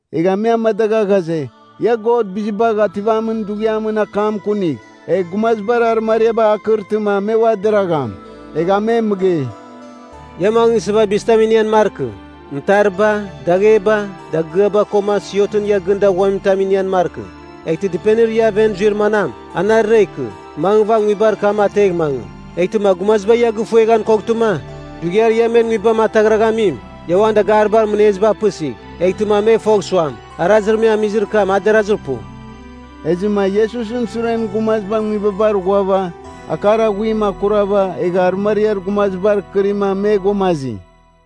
Egha me amadagha ghaze, ia God Bizibagh Ativamin Dughiamɨn akam kunigh, egh gumazibar arɨmariabar akɨrtɨma me ua deragham. Egha a me mɨgei, “Ia mangɨsɨva bizitam inian markɨ, mɨtariba, dagheba, dagɨaba, koma siotɨn ia gɨn daghuamin tam inian markɨ. Eghtɨ dɨpenir ia aven zuir manam, anarɨra ikɨ, mangɨva nguibar kam ategh mangɨ. Eghtɨma gumaziba ia gɨfueghan koghtɨma, dughiar ia men nguibam ataghraghamim, ia uan dagaribar mɨneziba apɨsigh, eghtɨma me fogh suam, arazir me amizir kam, a derazir pu.” Ezɨma Iesusɨn suren gumaziba nguibabar ghuava, akar aghuim akurava egha arɨmariar gumazibar kɨrima me ghuamazi.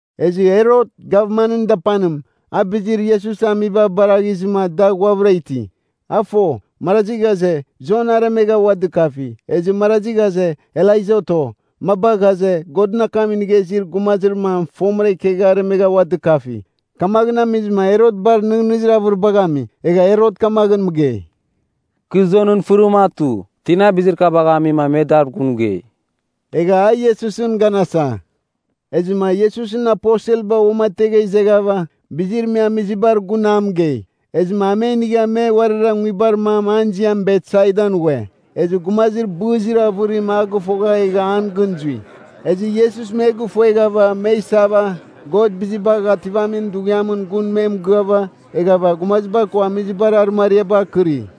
Ezɨ Herot, gavmanɨn dapanim, a bizir Iesus amiba baraghizɨma da ghuavɨra iti. A fo, marazi ghaze, Jon aremegha ua dɨkafi, ezɨ marazi ghaze, Elaija oto, maba ghaze, Godɨn akam inigha izir gumazir mam fomɨra ikegha aremegha ua dɨkafi. Kamaghɨn amizɨma Herot bar nɨghnɨzir avɨribagh ami. Egha Herot kamaghɨn mɨgei, “Kɨ Jonɨn fɨrim atu. Tina, bizir kabagh amima me dar gun mɨgei?” Egha a Iesusɨn ganasa. Ezɨma Iesusɨn aposelba uamategha izeghava, bizir me amizibar gun a mɨgei. Ezɨma a me inigha me uarira nguibar mam an ziam Betsaidan ghue. Ezɨ gumazir bɨzir avɨrim a gɨfoghava egha an gɨn zui. Ezɨ Iesus me gɨfueghava me isava, God Bizibagh Ativamin Dughiamɨn gun me mɨgɨava, eghava gumaziba ko amizibar arɨmariabar akɨri.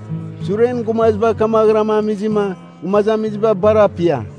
Suren gumaziba kamaghɨram amizɨma, gumazamiziba bar apia.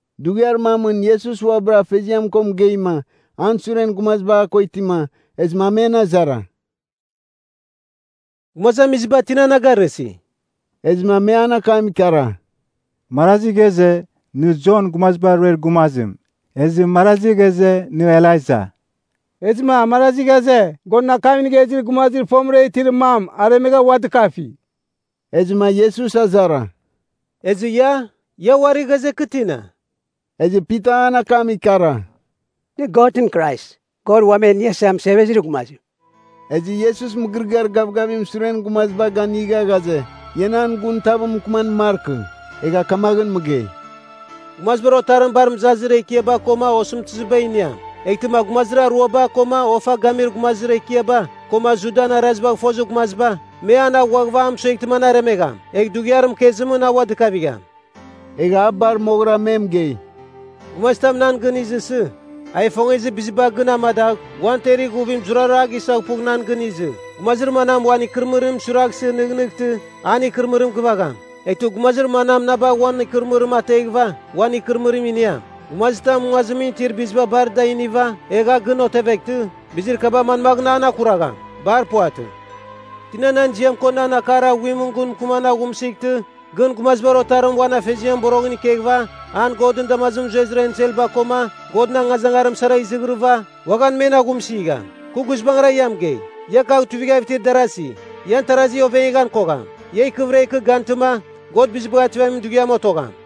Dughiar mamɨn Iesus uabɨra Afeziam ko mɨgeima, an suren gumaziba a ko itima, ezɨma a men azara, “Gumazamiziba tina na garɨsi?” Ezɨma me an akam ikara, “Marazi ghaze, nɨ Jon Gumaziba Ruer Gumazim, ezɨ marazi ghaze, nɨ Elaija, ezɨma marazi ghaze, Godɨn akam inigha izir gumazir fomɨra itir mam aremegha ua dɨkafi.” Ezɨma Iesus azara, “Ezɨ ia? Ia uari ghaze kɨ tina?” Ezɨ Pita an akam ikara, “Nɨ Godɨn Krais, God Uam E Iniasa Mɨsevezir Gumazim.” Ezɨ Iesus mɨgɨrɨgɨar gavgavim suren gumaziba ganɨga ghaze, ia nan gun tav mɨkɨman markɨ. Egha kamaghɨn mɨgei, “Gumazibar Otarim bar mɨzazir ekiaba koma osɨmtɨziba iniam. Eghtɨma gumazir aruaba, koma ofa gamir gumazir ekiaba, koma Judan arazibagh fozir gumaziba, me an aghuaghɨva a mɨsueghtɨma an aremegham. Egh dughiar mɨkezimɨn a ua dɨkavigham.” Egha a bar moghɨra me mɨgei, “Gumazitam nan gɨn izɨsɨ, a ifongezir biziba gɨn amadagh uan temer ighuvim zurara a gisaghpugh nan gɨn izɨ. Gumazir manam uan ikɨrɨmɨrim suiraghsɨ nɨghnɨghtɨ, an ikɨrɨmɨrim gɨvagham. Eghtɨ gumazir manam na bagh uan ikɨrɨmɨrim ateghɨva, uan ikɨrɨmɨrim iniam. Gumazitam nguazimɨn itir biziba bar da iniva, egh a gɨn oveghtɨ, bizir kaba manmaghɨn an akuragham? Bar puvatɨ. Tina nan ziam ko nan akar aghuimɨn gun mɨkɨman aghumsɨghtɨ gɨn Gumazibar Otarim uan afeziamɨn boroghɨn ikeghɨva an Godɨn damazimɨn zuezir enselba koma Godɨn angazangarim sara izighirɨva, uaghan men aghumsɨgham. Kɨ guizbangɨra ia mɨgei, ia kagh tuivighav itir darasi, ian tarazi oveghan kogham. Ia ikɨvɨra ikɨ gantɨma, God Bizibagh Ativamin Dughiam otogham.”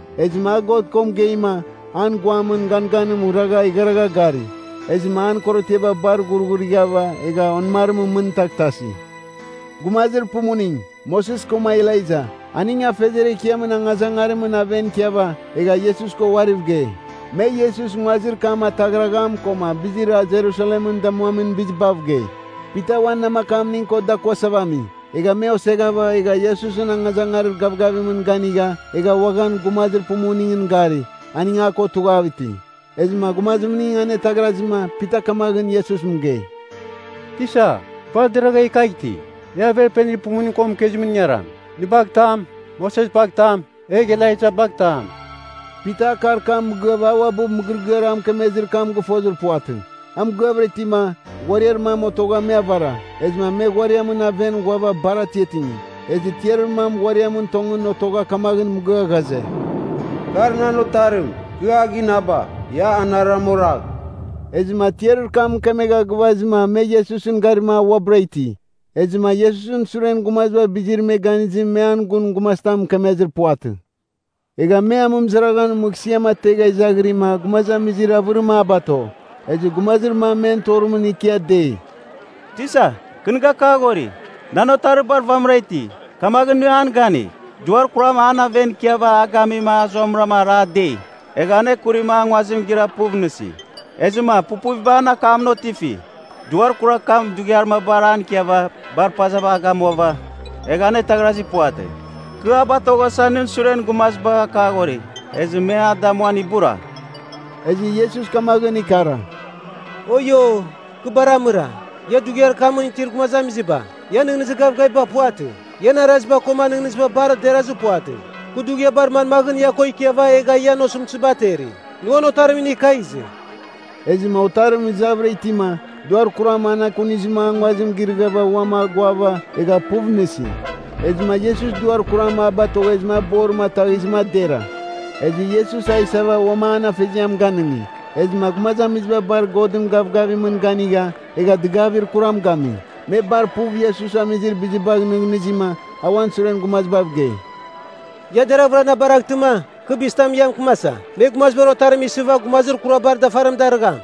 Ezɨma a God ko mɨgeima, an guamɨn ganganim ragha igharagha gari. Ezɨma an korotiaba bar ghurghurighava egha onɨmarimɨn mɨn taghtasi. Gumazir pumuning, Moses koma Elaija, aning Afeziar Ekiamɨn angazangarimɨn aven ikiava, egha Iesus ko uariv gei. Me Iesus nguazir kam ataghragham koma bizir a Jerusalemɨn damuamin bizibav gei. Pita uan namakamning ko dakuasava ami, egha me oseghava, egha Iesusɨn angazangarir gavgavimɨn ganigha egha uaghan gumazir pumuningɨn gari, aning a ko tughav iti. Ezɨma gumazimning ane ataghrazima Pita kamaghɨn Iesus mɨgei, “Tisa, bar deragha e kagh iti! E averpenir pumuning ko mɨkezimɨn ingaram. Nɨ bagh tam, Moses bagh tam, egh Elaija bagh tam.” (Pita akar kam mɨgɨava a uabɨ mɨgɨrɨgɨar a mɨkemezir kam gɨfozir puvatɨ.) A mɨgɨavɨra itima, ghuariar mam otogha me avara, ezɨma me ghuariamɨn aven ghuava bar atiatingi. Ezɨ tiarir mam ghuariamɨm tongɨn otogha kamaghɨn mɨgɨa ghaze, “Kar nan Otarim, kɨ a ginaba. Ia anarɨram oragh!” Ezɨma tiarir kam mɨkemegha gɨvazɨma me Iesusɨn garima a uabɨra iti. Ezɨma Iesusɨn suren gumaziba bizir me ganizim me an gun gumazitam mɨkemezir puvatɨ. Egha me amɨmɨzaraghɨn mɨghsɨam ategha izaghirima gumazamizir avɨrim a bato. Ezɨ gumazir mam men torimɨn ikia dei, “Tisa, kɨ nɨ gakaghori, nan otarir bar vamɨra iti, kamaghɨn nɨ an ganigh. Duar kuram an aven ikiava a gamima a zuamɨra ara dei. Egha anekurima a nguazim gira puv nɨsi. Ezɨma pupuviba an akamɨn otifi. Duar kurar kam dughiar mabar an ikiava bar pazava a gamuava, egha anetaghrazir puvatɨ. Kɨ a batoghasa nɨn suren gumazibagh akaghori. Ezɨ me a damuan ibura.” Ezɨ Iesus kamaghɨn ikara, “Oio, kɨ bar amɨra, ia dughiar kamɨn itir gumazamiziba, ian nɨghnɨzir gavgaviba puvatɨ, ian araziba koma nɨghnɨziba bar derazir puvatɨ. Kɨ dughiabar manmaghɨn ia ko ikiava egha ian osɨmtɨziba ateri? Nɨ uan otarim inigh kagh izɨ.” Ezɨma otarim izavɨra itima, duar kuram an ekunizɨma a nguazim girɨghava uam aguava egha puv nɨsi. Ezɨma Iesus duar kuram a batoghezɨma a borim ataghizɨma a dera. Ezɨ Iesus a isava uam an afeziam ganɨngi. Ezɨma gumazamiziba bar Godɨn gavgavimɨn ganigha egha dɨgavir kuram gami. Me bar puv Iesus amizir bizibagh nɨghnɨzima, a uan suren gumazibav gei, “Ia deraghvɨra na baraghtɨma, kɨ bizitam ia mɨkɨmasa. Me Gumazibar Otarim isɨva gumazir kurabar dafarim darɨgham.”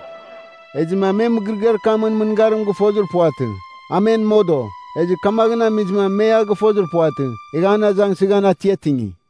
Ezɨma me mɨgɨrɨgɨar kamɨn mɨngarim gɨfozir puvatɨ. A men modo, ezɨ kamaghɨn amizɨma me a gɨfozir puvatɨ. Egha an azangsɨghan atiatingi.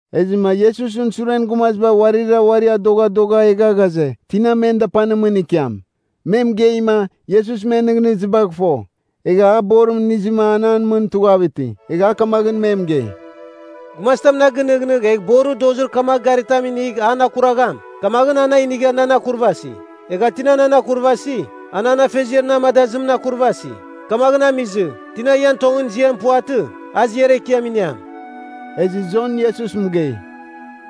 Ezɨma Iesusɨn suren gumaziba uarira uari adoghadogha egha ghaze, tina men dapanimɨn ikiam. Me mɨgeima, Iesus men nɨghnɨzibagh fo, egha a borim inizɨma an an mɨn tughav iti. Egha a kamaghɨn me mɨgei, “Gumazitam na gɨnɨghnɨgh egh borir dozir kamagh garitam inigh an akuragham, kamaghɨn a na inigha nan akurvasi. Egha tina nan akurvasi, a nan Afeziar na amadazimɨn akurvasi. Kamaghɨn amizɨ, tina ian tongɨn ziam puvatɨ, a ziar ekiam iniam.” Ezɨ Jon Iesus mɨgei,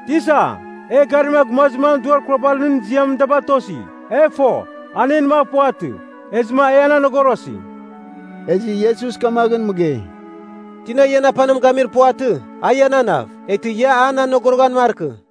“Tisa, e garima gumazir mam duar kurabar nɨn ziamɨn da batosi. E fo, a en mav puvatɨ, ezɨma e an anogorosi.” Ezɨ Iesus kamaghɨn mɨgei, “Tina ian apanim gamir puvatɨ, a iananav. Eghtɨ, ia an anogoroghan markɨ.”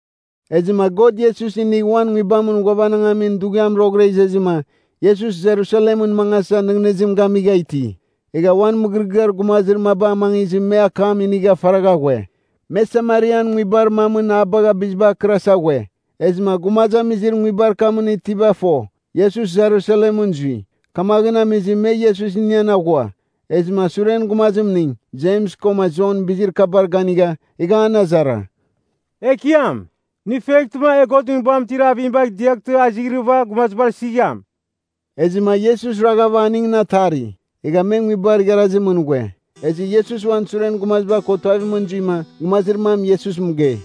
Ezɨma God Iesus inigh uan Nguibamɨn ghuavanangamin dughiam roghɨra izezɨma, Iesus Jerusalemɨn mangasa nɨghnɨzim gamigha iti. Egha uan mɨgɨrɨgɨar gumazir maba amangizɨma me akam inigha faragha ghue. Me Samarian nguibar mamɨn a bagha bizibar akɨrasa ghue. Ezɨma gumazamizir nguibar kamɨn itiba fo, Iesus Jerusalemɨn zui, kamaghɨn amizɨma me Iesus inian aghua. Ezɨma suren gumazimning, Jems koma Jon bizir kabar ganigha, egha an azara, “Ekiam, nɨ ifueghtɨma e Godɨn Nguibamɨn itir avim bagh diaghtɨma a izighrɨva gumazibar isigham.” Ezɨma Iesus raghava aningɨn atari. Egha me nguibar igharazimɨn ghue. Ezɨ Iesus uan suren gumaziba ko tuavimɨn zuima, gumazir mam Iesus mɨgei,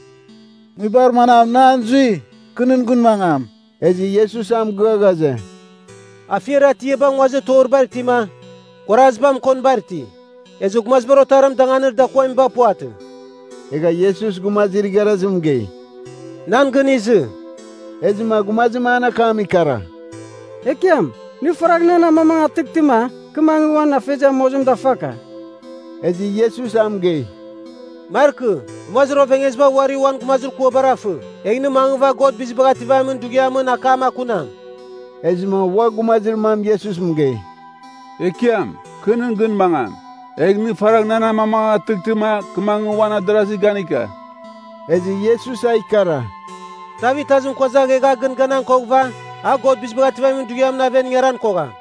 “Nguibar manam nɨ an zui, kɨ nɨn gɨn mangam.” Ezɨ Iesus a mɨgɨa ghaze, “Afiar atiaba nguazir toribar itima, kuaraziba mɨkonibar iti, ezɨ Gumazibar Otarim danganir dakuamiba puvatɨ.” Egha Iesus gumazir igharazim mɨgei, “Nan gɨn izɨ.” Ezɨma gumazim an akam ikara, “Ekiam, nɨ faragh na amamangatɨghtɨma, kɨ mangɨ uan afeziam mozim dafaka.” Ezɨ Iesus a mɨgei, “Markɨ. Gumazir ovengeziba uari uan gumazir kuabar afɨ. Egh nɨ mangɨva God Bizibagh Ativamin Dughiamɨn akam akunam.” Ezɨma ua gumazir mam Iesus mɨgei, “Ekiam, kɨ nɨn gɨn mangam. Egh nɨ faragh nan amamangatɨghtɨma kɨ mangɨva uan adarazir ganika.” Ezɨ Iesus a ikara, “Tav itazim kuazagh egh a gɨn ganan koghɨva, a God Bizibagh Ativamin Dughiamɨn aven ingaran kogham.”